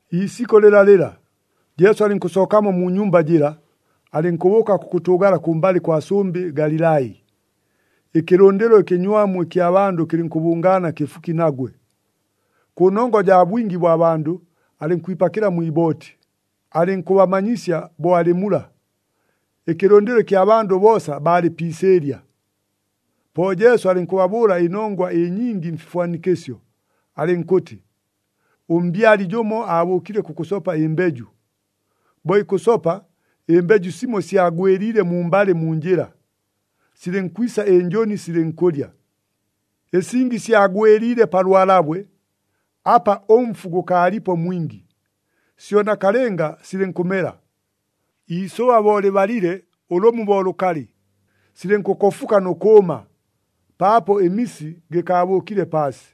Iisikʉ lɨlalɨla, Jesu alɨnkʉsookamo mu nyumba jɨla, alɨnkʉbʉʉka kʉkʉtʉʉgala kʉmbalɨ kwa sʉmbɨ Galilai. Ɨkɨlʉndɨlo ɨkɨnywamu ɨkya bandʉ kɨlɨnkʉbʉngaana kɨfuki nagwe. Kʉnongwa jaa bwingi bwa bandʉ, alɨnkwipakɨla mwi ibooti, alɨnkʉbamanyisya bo alɨ mula. Ɨkɨlʉndɨlo ɨkya bandʉ boosa baalɨ pi isɨɨlya. Po Jesu alɨnkʉbabʉʉla ɨnongwa ɨnyingi mfifwanikɨsyo, alɨnkʉtɨ, “Ʉmbyali jʉmo aabʉʉkile kʉkʉsopa ɨmbeju. Bo ikʉsopa, ɨmbeju simo syagwɨliile mumbalɨ mu njɨla, silɨnkwisa ɨnjʉni silɨnkʉlya. Ɨsingi syagwɨliile pa lwalabwe, apa ʉmfu gʉkaalipo mwingi. Syo nakalɨnga silɨnkʉmela. Iisʉba bo lɨbalile ʉlʉmu bo lʉkalɨ, silɨnkʉkofuka nʉ kʉʉma, paapo ɨmisi gɨkaabʉʉkile paasi.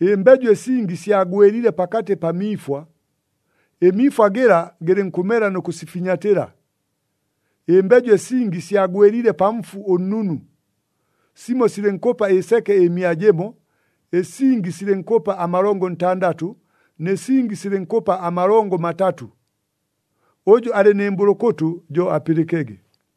Ɨmbeju ɨsingi syagwɨliile pakatɨ pa miifwa. Ɨmiifwa gɨla gɨlɨnkʉmela nʉ kʉsifinyatɨla. Ɨmbeju ɨsingi syagwɨliile pa mfu ʉnnunu. Simo silɨnkʉpa ɨseke ɨmia jɨmo, ɨsingi silɨnkʉpa amalongo ntandatʉ, nɨ singi silɨnkʉpa amalongo matatʉ. Ʉjʉ alɨ nɨ mbʉlʉkʉtʉ, jo apɨlɨkege!”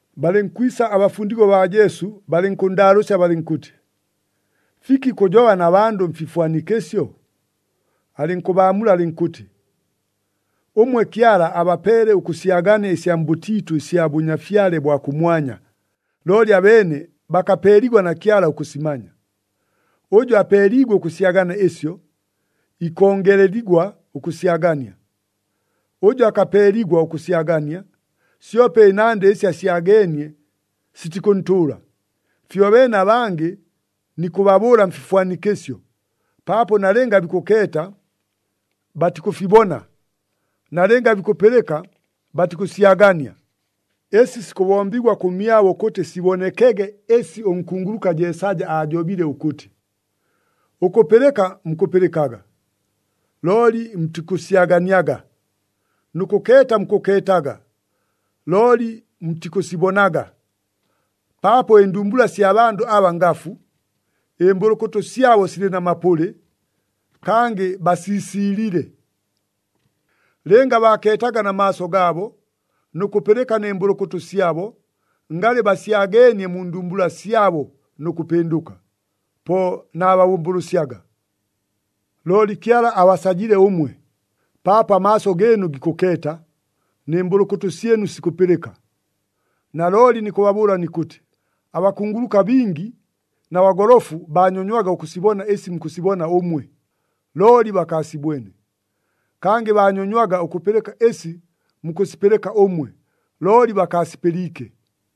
Balɨnkwisa abafundigwa baa Jesu balɨnkʉnndaalʉʉsya balɨnkʉtɨ, “Fiki kʉjoba na bandʉ mfifwanikɨsyo?” Alɨnkʉbaamula alɨnkʉtɨ, “Ʉmwe Kyala abapeele ʉkʉsyagania ɨsya mbʉtiitʉ ɨsya Bʉnyafyale bwa kʉmwanya, looli abeene bakapeeligwa na Kyala ʉkʉsimanya. Ʉjʉ apeeliigwe ʉkʉsyagania ɨsyo, ikongeleligwa ʉkʉsyagania. Ʉjʉ akapeeligwa ʉkʉsyagania, syope ɨnandɨ ɨsi asyageenie sitikʉntʉʉla. Fyobeene abangɨ nikʉbabʉʉla mfifwanikɨsyo, paapo, nalɨnga bikʉkeeta, batikʉfibona, nalɨnga bikʉpɨlɨka, batikʉsyagania. Ɨsi sikʉbombigwa kʉmyabo ʉkʉtɨ sibonekege ɨsi ʉnkunguluka Jeesaja aajobile ʉkʉtɨ, ‘Ʉkʉpɨlɨka mukʉpɨlɨkaga, looli mutikʉsyaganiaga. Nʉ kʉkeeta mukʉkeetaga, looli mutikʉsibonaga. Paapo ɨndumbula sya bandʉ aba ngafu, ɨmbʉlʉkʉtʉ syabo silɨ na mapʉlɨ, kangɨ basiisiilile. Lɨnga baakeetaga na maaso gaabo, nʉ kʉpɨlɨka nɨ mbʉlʉkʉtʉ syabo, ngalɨ basyageenie mu ndumbula syabo nʉ kʉpɨndʉka, po naababʉmbʉlʉsyaga.’ “Looli Kyala abasajile ʉmwe, paapo amaaso gɨɨnu gikʉkeeta, nɨ mbʉlʉkʉtʉ syɨnu sikʉpɨlɨka. Nalooli nikʉbabʉʉla nikʉtɨ, abakunguluka bingi na bagolofu baanyonywaga ʉkʉsibona ɨsi mukʉsibona ʉmwe, looli bakaasibwene. Kangɨ baanyonywaga ʉkʉpɨlɨka ɨsi mukʉsipɨlɨka ʉmwe, looli bakaasipɨliike.”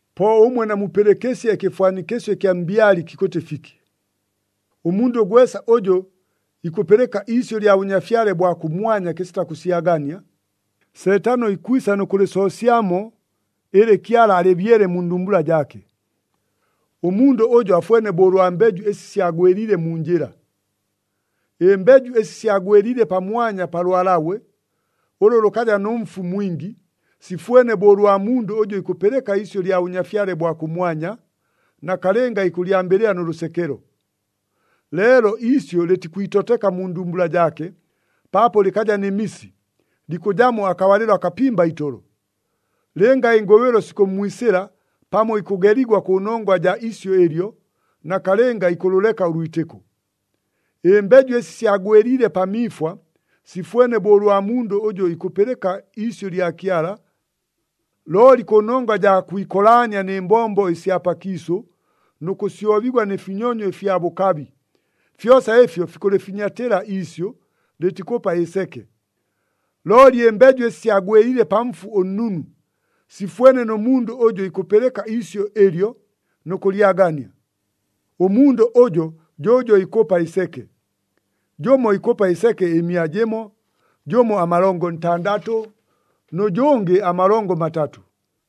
“Po ʉmwe namupɨlɨkɨsye ɨkɨfwanikɨsyo ɨkya mbyali kikʉtɨ fiki. Ʉmundʉ gwesa ʉjʉ ikʉpɨlɨka iisyʉ lya Bʉnyafyale bwa kʉmwanya kɨsita kʉsyagania, Seetano ikwisa nʉ kʉlɨsoosyamo ɨlɨ Kyala alɨbyele mu ndumbula jaake. Ʉmundʉ ʉjo afwene bo ʉlwa mbeju ɨsi syagwɨliile mu njɨla. Ɨmbeju ɨsi syagwɨliile pamwanya pa lwalabwe, ʉlʉ lʉkaja nʉ mfu mwingi, sifwene bo ʉlwa mundʉ ʉjʉ ikʉpɨlɨka iisyʉ lya Bʉnyafyale bwa kʉmwanya, nakalɨnga ikʉlyambɨlɨla nʉ lʉsekelo. Leelo iisyʉ lɨtikwitoteka mu ndumbula jaake, paapo lɨkaja nɨ misi, likʉjamo akabalɨlo akapimba itolo. Lɨnga ɨngʉbɨlo sikʉmmwisɨla pamo ikʉgeligwa kʉnongwa jaa isyʉ ɨlyo, nakalɨnga ikʉlʉleka ʉlwitɨko. Ɨmbeju ɨsi syagwɨliile pa miifwa, sifwene bo ʉlwa mundʉ ʉjʉ ikʉpɨlɨka iisyʉ lya Kyala, looli kʉnongwa jaa kwikolaania, nɨ mbombo ɨsya pakiisʉ, nʉ kʉsyobigwa, nɨ finyonyo ɨfya bʉkabi, fyosa ɨfyo fikʉlɨfinyatɨla iisyʉ, lɨtikʉpa ɨseke. Looli ɨmbeju ɨsi syagwɨliile pa mfu ʉnnunu, sifwene nʉ mundʉ ʉjʉ ikʉpɨlɨka iisyʉ ɨlyo nʉ kʉlyagania. Ʉmundʉ ʉjo jo ʉjʉ ikʉpa ɨseke. Jʉmo ikʉpa ɨseke ɨmia jɨmo, jʉmo amalongo ntandatʉ, nʉ jʉngɨ amalongo matatʉ.”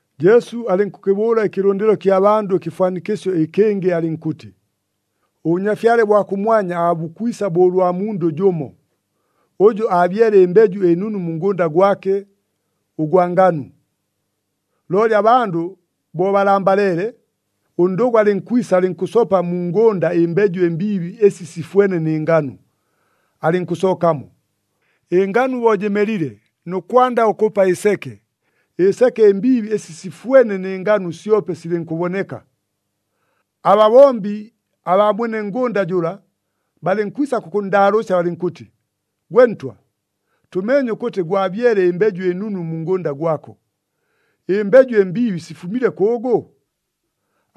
Jesu alɨnkʉkɨbʉʉla ɨkɨlʉndɨlo kya bandʉ ɨkɨfwanikɨsyo ɨkɨngɨ alɨnkʉtɨ, “ɄBʉnyafyale bwa kʉmwanya aabukwisa bo ʉlwa mundʉ jʉmo, ʉjʉ aabyele ɨmbeju ɨnunu mu ngʉnda gwake ʉgwa nganu. Looli abandʉ bo balambaleele, ʉndʉgʉ alɨnkwisa alɨnkʉsopa mu ngʉnda ɨmbeju ɨmbiibi ɨsi sifwene nɨ nganu, alɨnkʉsookamo. Ɨnganu bo jɨmelile nʉ kwanda ʉkʉpa ɨseke, ɨseke ɨmbiibi ɨsi sifwene nɨ nganu syope silɨnkʉboneka. Ababombi abaa mwene ngʉnda jʉla, balɨnkwisa kʉkʉnndaalʉʉsya balɨnkʉtɨ, ‘Gwe ntwa, tʉmeenye ʉkʉtɨ gwabyele ɨmbeju ɨnunu mu ngʉnda gwako, ɨmbeju ɨmbiibi sifumile kʉʉgʉ?’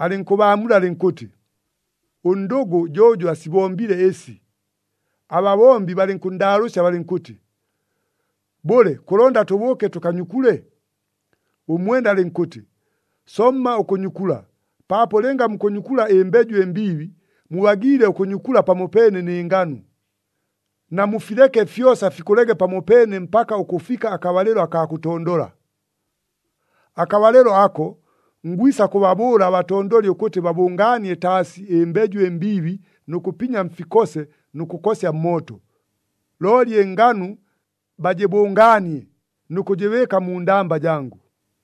Alɨnkʉbaamula alɨnkʉtɨ, ‘Ʉndʉgʉ jo ʉjʉ asibombile ɨsi.’ Ababombi balɨnkʉnndaalʉʉsya balɨnkʉtɨ, ‘Bʉle, kʉlonda tʉbʉʉke tʉkanyukule?’ Ʉmwene alɨnkʉtɨ, ‘Somma ʉkʉnyukula, paapo lɨnga mukʉnyukula ɨmbeju ɨmbiibi, mubagiile ʉkʉnyukula pamopeene nɨ nganu. Namufileke fyosa fikʉlege pamopeene mpaka ʉkʉfika akabalɨlo akaa kʉtondola. Akabalɨlo ako, ngwisa kʉbabʉʉla abatondoli ʉkʉtɨ babʉngaanie taasi ɨmbeju ɨmbiibi nʉ kʉpinya mfikose nʉ kʉkosya mmooto. Looli ɨnganu bajɨbʉngaanie nʉ kʉjɨbɨɨka mu ndamba jangʉ.’”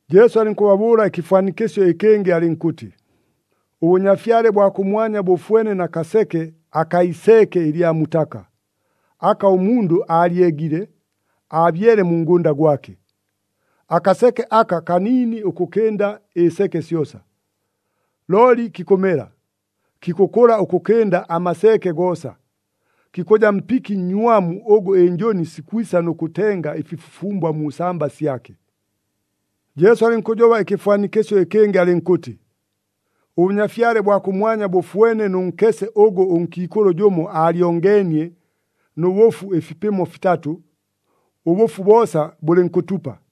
Jesu alɨnkʉbabʉʉla ɨkɨfwanikɨsyo ɨkɨngɨ alɨnkʉtɨ, “ɄBʉnyafyale bwa kʉmwanya bʉfwene na kaseke akaa iseeke ɨlya mutaka, aka ʉmundʉ aalyegile, aabyele mu ngʉnda gwake. Akaseke aka kaniini ʉkʉkɨnda ɨseke syosa. Looli kikʉmela, kikʉkʉla ʉkʉkɨnda amaseeke goosa, kikʉja mpiki nnywamu ʉgʉ ɨnjʉni sikwisa nʉ kʉtenga ɨfifufumbwa mu samba syake.” Jesu alɨnkʉjoba ɨkɨfwanikɨsyo ɨkɨngɨ alɨnkʉtɨ, “ɄBʉnyafyale bwa kʉmwanya bʉfwene nʉ nkese ʉgʉ ʉnkiikʉlʉ jʉmo aalyongeenie nʉ bʉfu ɨfipɨmo fitatʉ, ʉbʉfu boosa bʉlɨnkʉtupa.”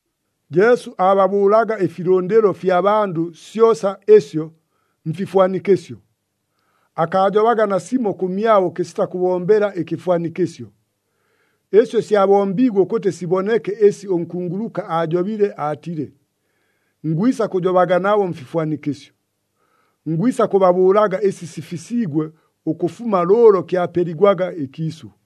Jesu aababʉʉlaga ɨfilʉndɨlo ɨfya bandʉ syosa ɨsyo mfifwanikɨsyo. Akaajobaga nasimo kʉmyabo kɨsita kʉbombela ɨkɨfwanikɨsyo. Ɨsyo syabombiigwe ʉkʉtɨ siboneke ɨsi ʉnkunguluka aajobile aatile, “Ngwisa kʉjobaga nabo mfifwanikɨsyo. Ngwisa kʉbabʉʉlaga ɨsi sifisiigwe ʉkʉfuma lʉʉlo kyapeligwaga ɨkiisʉ.”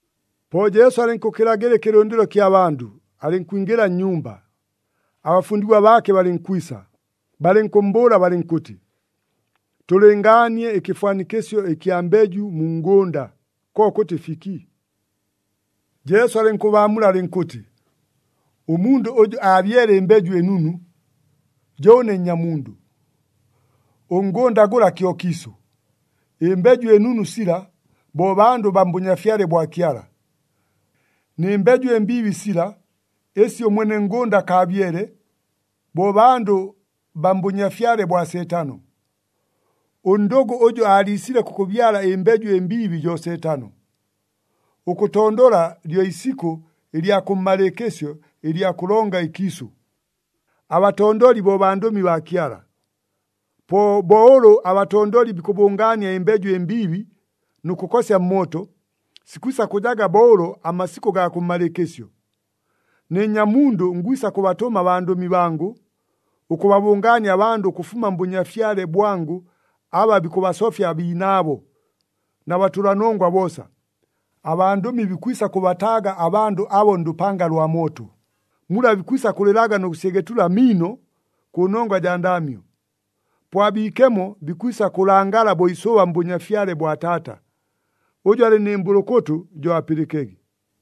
Po Jesu alɨnkʉkɨlaga ɨkɨlʉndɨlo kya bandʉ, alɨnkwingɨla nnyumba. Abafundigwa baake balɨnkwisa, balɨnkʉmmbʉʉla balɨnkʉtɨ, “Tʉlɨngaanie ɨkɨfwanikɨsyo ɨkya mbeju mu ngʉnda, kokʉtɨ fiki?” Jesu alɨnkʉbaamula alɨnkʉtɨ, “Ʉmundʉ ʉjʉ aabyele ɨmbeju ɨnunu, jo ʉne Nnyamundʉ. Ʉngʉnda gʉla kyo kiisʉ, ɨmbeju ɨnunu sila, bo bandʉ baa mBʉnyafyale bwa Kyala, nɨ mbeju ɨmbiibi sila, ɨsi ʉmwene ngʉnda akaabyele, bo bandʉ baa mbʉnyafyale bwa Seetano. Ʉndʉgʉ ʉjʉ aaliisile kʉkʉbyala ɨmbeju ɨmbiibi jo Seetano. Ʉkʉtondola lyo isikʉ ɨlya kʉmmalɨɨkɨsyo ɨlya kʉlonga ɨkiisʉ. Abatondoli bo bandʉmi baa Kyala. Po bo ʉlʉ abatondoli bikʉbʉngaania ɨmbeju ɨmbiibi nʉ kʉkosya mmooto, sikwisa kʉjaga bo ʉlo amasikʉ gaa kʉmmalɨɨkɨsyo. Ne Nnyamundʉ ngwisa kʉbatʉma abandʉmi bangʉ, ʉkʉbabʉngaania abandʉ ʉkʉfuma mBʉnyafyale bwangʉ aba bikʉbasofya abiinaabo, na batʉlanongwa boosa. Abandʉmi bikwisa kʉbataaga abandʉ abo ndʉpanga lwa mooto, mula bikwisa kʉlɨlaga nʉ kʉsyegetula amiino kʉnongwa jaa ndaamyo. Po abiikemo bikwisa kʉlangala bo isʉba mBʉnyafyale bwa Taata. Ʉjʉ alɨ nɨ mbʉlʉkʉtʉ, jo apɨlɨkege!”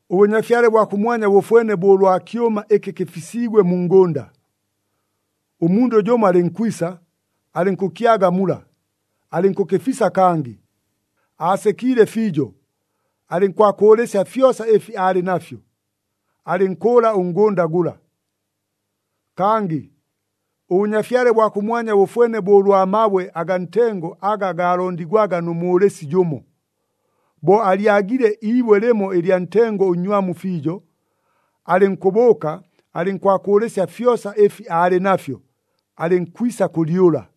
“ɄBʉnyafyale bwa kʉmwanya bʉfwene bo ʉlwa kyʉma ɨkɨ kɨfisiigwe mu ngʉnda. Ʉmundʉ jʉmo alɨnkwisa, alɨnkʉkyaga mula, alɨnkʉkɨfisa kangɨ. Aasekiile fiijo, alɨnkwakʉʉlɨsya fyosa ɨfi aalɨ nafyo, alɨnkʉʉla ʉngʉnda gʉla. “Kangɨ ʉBʉnyafyale bwa kʉmwanya bʉfwene bo ʉlwa mabwe agaa ntengo aga gaalondigwaga nʉ mʉʉlɨsi jʉmo. Bo alyagile iibwe lɨmo ɨlya ntengo ʉnnywamu fiijo, alɨnkʉbʉʉka, alɨnkwakʉʉlɨsya fyosa ɨfi aalɨ nafyo, alɨnkwisa kʉlyʉla.”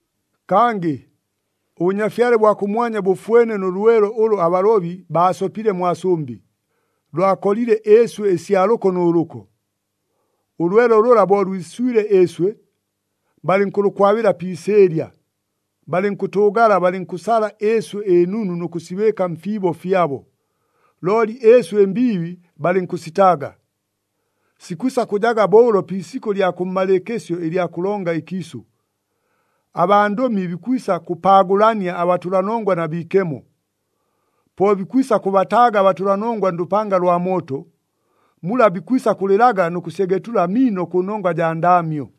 “Kangɨ ʉBʉnyafyale bwa kʉmwanya bʉfwene nʉ lwelo ʉlʉ abalobi baasopile mwa sʉmbɨ, lwakolile ɨɨswɨ ɨsya lʉko nʉ lʉko. Ʉlwelo lʉla bo lwiswile ɨɨswɨ, balɨnkʉlʉkwabɨla pi isɨɨlya, balɨnkʉtʉʉgala balɨnkʉsala ɨɨswɨ ɨnunu nʉ kʉsibɨɨka mfiibo fyabo, looli ɨɨswɨ ɨmbiibi balɨnkʉsitaaga. Sikwisa kʉjaga bo ʉlo pi isikʉ ɨlya kʉmmalɨɨkɨsyo ɨlya kʉlonga ɨkiisʉ. Abandʉmi bikwisa kʉpaagʉlania abatʉlanongwa na biikemo. Po bikwisa kʉbataaga abatʉlanongwa ndʉpanga lwa mooto, mula bikwisa kʉlɨlaga nʉ kʉsyegetula amiino kʉnongwa jaa ndaamyo.”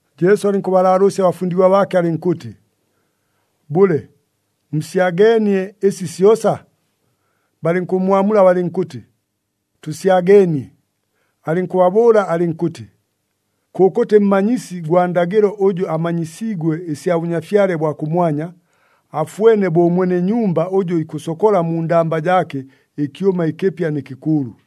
Jesu alɨnkʉbalaalʉʉsya abafundigwa baake alɨnkʉtɨ, “Bʉle, musyageenie ɨsi syosa?” Balɨnkʉmmwamula balɨnkʉtɨ, “Tʉsyageenie.” Alɨnkʉbabʉʉla alɨnkʉtɨ, “Kʉkʉtɨ mmanyisi gwa ndagɨlo ʉjʉ amanyisiigwe ɨsya Bʉnyafyale bwa kʉmwanya, afwene bo ʉmwene nyumba ʉjʉ ikʉsokola mu ndamba jaake ɨkyʉma ɨkɨpya nɨ kɨkʉʉlʉ.”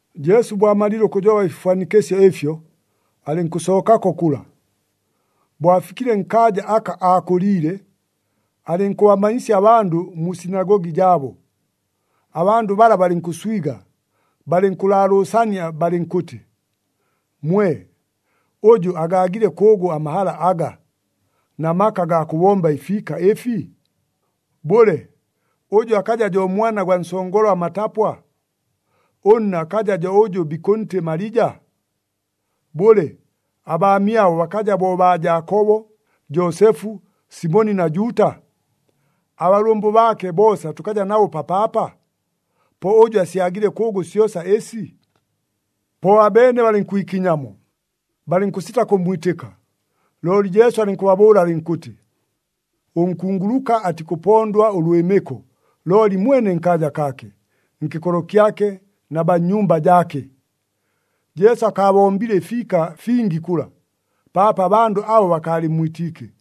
Jesu bo amalile ʉkʉjoba ɨfifwanikɨsyo ɨfyo, alɨnkʉsookako kʉla. Bo afikile nkaaja aka aakʉliile, alɨnkʉbamanyisya abandʉ mu sinagogi jaabo. Abandʉ bala balɨnkʉswiga, balɨnkʉlaalʉʉsania balɨnkʉtɨ, “Mwe! Ʉjʉ agaagile kʉʉgʉ amahala aga, na maka agaa kʉbomba ɨfiika ɨfi? Bʉle, ʉjʉ akaja jo mwana gwa nsongola matapwa? Ʉnna akaja jo ʉjʉ bikʉntɨ Malija? Bʉle, abaamyabo bakaja bo baa Jaakobo, Joosefu, Simoni na Juuta? Abalʉmbʉ baake boosa tʉkaja nabo papaapa? Po ʉjʉ asyagile kʉʉgʉ syosa ɨsi?” Po abeene balɨnkwikinyamo, balɨnkʉsita kʉmmwitɨka. Looli Jesu alɨnkʉbabʉʉla alɨnkʉtɨ, “Ʉnkunguluka atikʉpondwa ʉlwɨmɨko looli mwene nkaaja kaake, nkɨkolo kyake na baa mu nyumba jaake.” Jesu akaabombile ɨfiika fingi kʉla, paapo abandʉ abo bakaalɨmmwitiike.